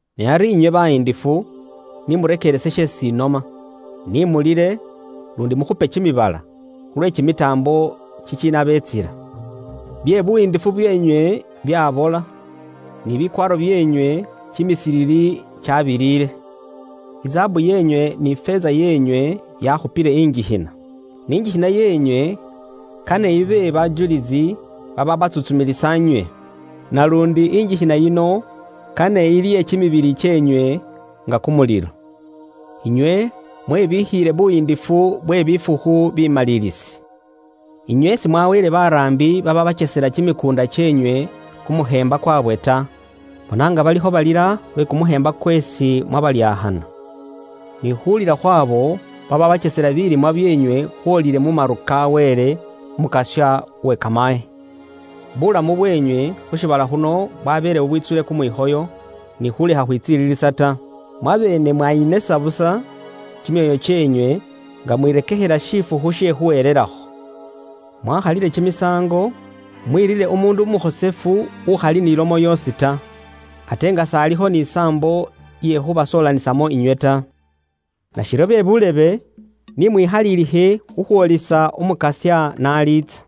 Ne ari inywe bayiindifu, ni murekeerese sheesi inoma. Ni mulile, luundi mukhupe kimibala, khulwe kimitaambo kikiinabeetsila. Bye buyiindifu byeenywe byaabola, ni bikwaaro byeenywe kimisilili kyaabiliile. Izaabu yeenywe ni ifeeza yeenywe yaakhupile ingikhina, ni ingikhina yeenywe kane ibe bajulisi babaabatsuntsumilisa inywe. Naluundi ingikhina yino kane ilye kimibili kyeenywe nga kumulilo. Inywe mwebikhiile buyiindifu bwe bifukhu bimaliilisi. Inywe simwaweele baraambi babaabakyesela kimikuunda kyeenywe kumukheemba kwaabwe ta. Bona nga balikho balila lwe kumukheemba kweesi mwabalyakhana. Ni khuulila khw'abo babaabakyesela bilimwa byeenywe khwoolile mu maru ka Wele, Umukasya uwe kamaye. Buulamu bweenywe khu shiibala khuno bwabeele bubwitsuule kumwikhoyo, ni khuulekha khwitsililisa ta. Mwabeene mwayinesa busa kimyoyo kyeenywe nga mwirekekhela shifukhu she khuhelelakho. Mwaakhalile kimisaango, mwerire umuundu umukhosefu ukhali ni lomo yoosi ta, ate nga s'alikho ni saambo iye khuubasoolanisamo inywe ta. Nashiryo be buulebe, ni mwikhalilikhe khukhwoolisa Umukasya n'aliitsa.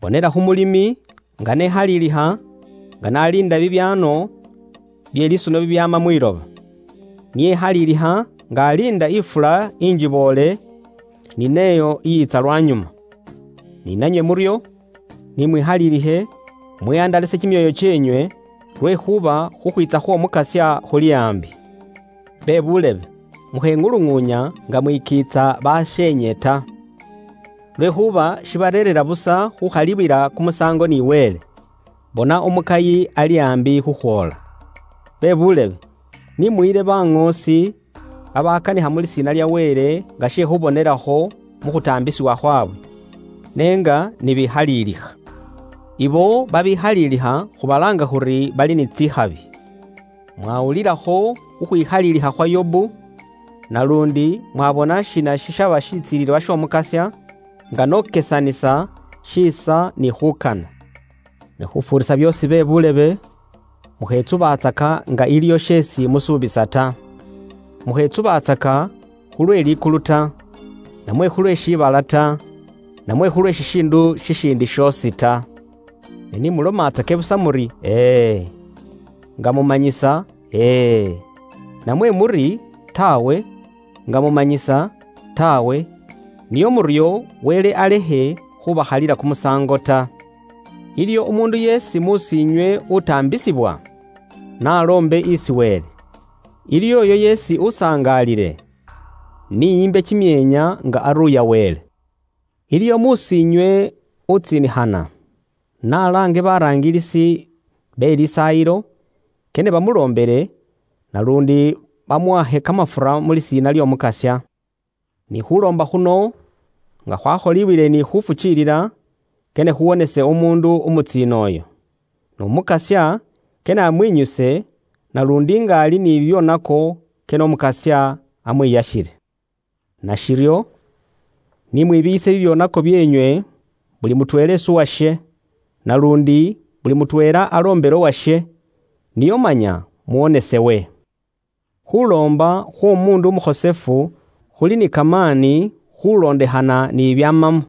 Bonela khu mulimi nga ni ekhalilikha nga n'aliinda bibyaano bye lisuno bibyaama mwiloba. Niye ekhalilikha nga aliinda ifula ingiboole ni n'eyo iyiitsa lwanyuma. Ni nanywe muryo, nimwikhaliilikhe, mwihandalase kimyoyo kyeenywe, lwekhuuba khukhwiitsa khw'Omukasya khuli aambi. Bebuulebe, mukheŋuluŋuunya nga mwikiitsa basheenywe ta. Lwekhuuba shibareerera busa khukhaliwila kumusaango ni Wele. Bona umukayi ali aambi khukhwoola. Bebuulebe, ni muyile baŋoosi babakanikha mu lisiina lya Wele nga she khubonelakho mu khutaambisibwa khwaabwe, ne nga bekhalilikha. Ibo babekhalilikha khubalaanga khuri bali ni tsikhabi. Mwawulilakho khukhwikhalilikha khwa Yobu, naluundi mwabona shiina shishaba shitsilililwa sh'Omukasya, nga n'okesanisa shiisa ni khuukana. Ne khufuurisa byoosi be buulebe, mukhetsubatsaka nga iliyo sheesi musuubisa ta. Mukhetsubatsaka khulwe likulu ta, namwe khulwe shiibala ta, namwe khulwe shishiindu shishiindi shoosi ta. Ne ni mulomatsake busa muri, “E e” nga mumanyisa “E e” namwe muri, “Taawe” nga mumanyisa “Taawe.” Nio muryo, Wele alekhe khubakhalila kumusaango ta. Iliwo umuundu yeesi mus'iinywe utaambisibwa? N'aloombe isi Wele. Iliwo uyo yeesi usangaalile? Ni embe kimyeenya nga aruuya Wele. Iliwo mus'iinywe umuundu utsiinikhana? N'alaange basaayi be mu lisaayilo, kane bamuloombele, naluundi bamuhakhe kamafura mu lisiina ly'Omukasya. Ni khuuloomba khuno nga khwakholibwile ni khuufukiilila, kane khuwonese umuundu umutsiina uyo. N'Umukasya kane amwinyuse, naluundi nga ali ni bibyoonako, kane Umukasya amwiyakhile. Nashiryo, ni mwibiiyise bibyoonako byeenywe, buli mutweela isi uwashe, naluundi buli mutweela aloombele uwashe, nio manya muwonesewe. Khuloomba khw'omuundu umukhosefu khuli ni kamaani khulondekhana ni bibyaamamo.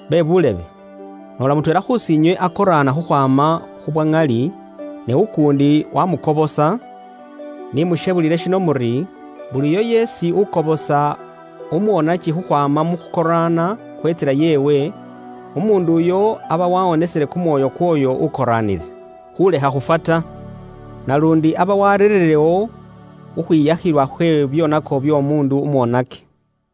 Bebuulebe, noola mutweela khus'inywe akoraana khukhwaama khu bwa ŋali, ne ukuundi waamukobosa, Pet 4.8ni mukhebulile shino muri, buli uyo yeesi ukobosa umwoonaki khukhwaama mu khukoraana khwe ntsila yeewe, umuundu uyo aba wawonesile kumwoyo kw'oyo ukoraanile, khuulekha khufwa ta. Naluundi aba wareerewo khukhwiyakhilwa khwe bibyoonako by'omuundu umwoonaki.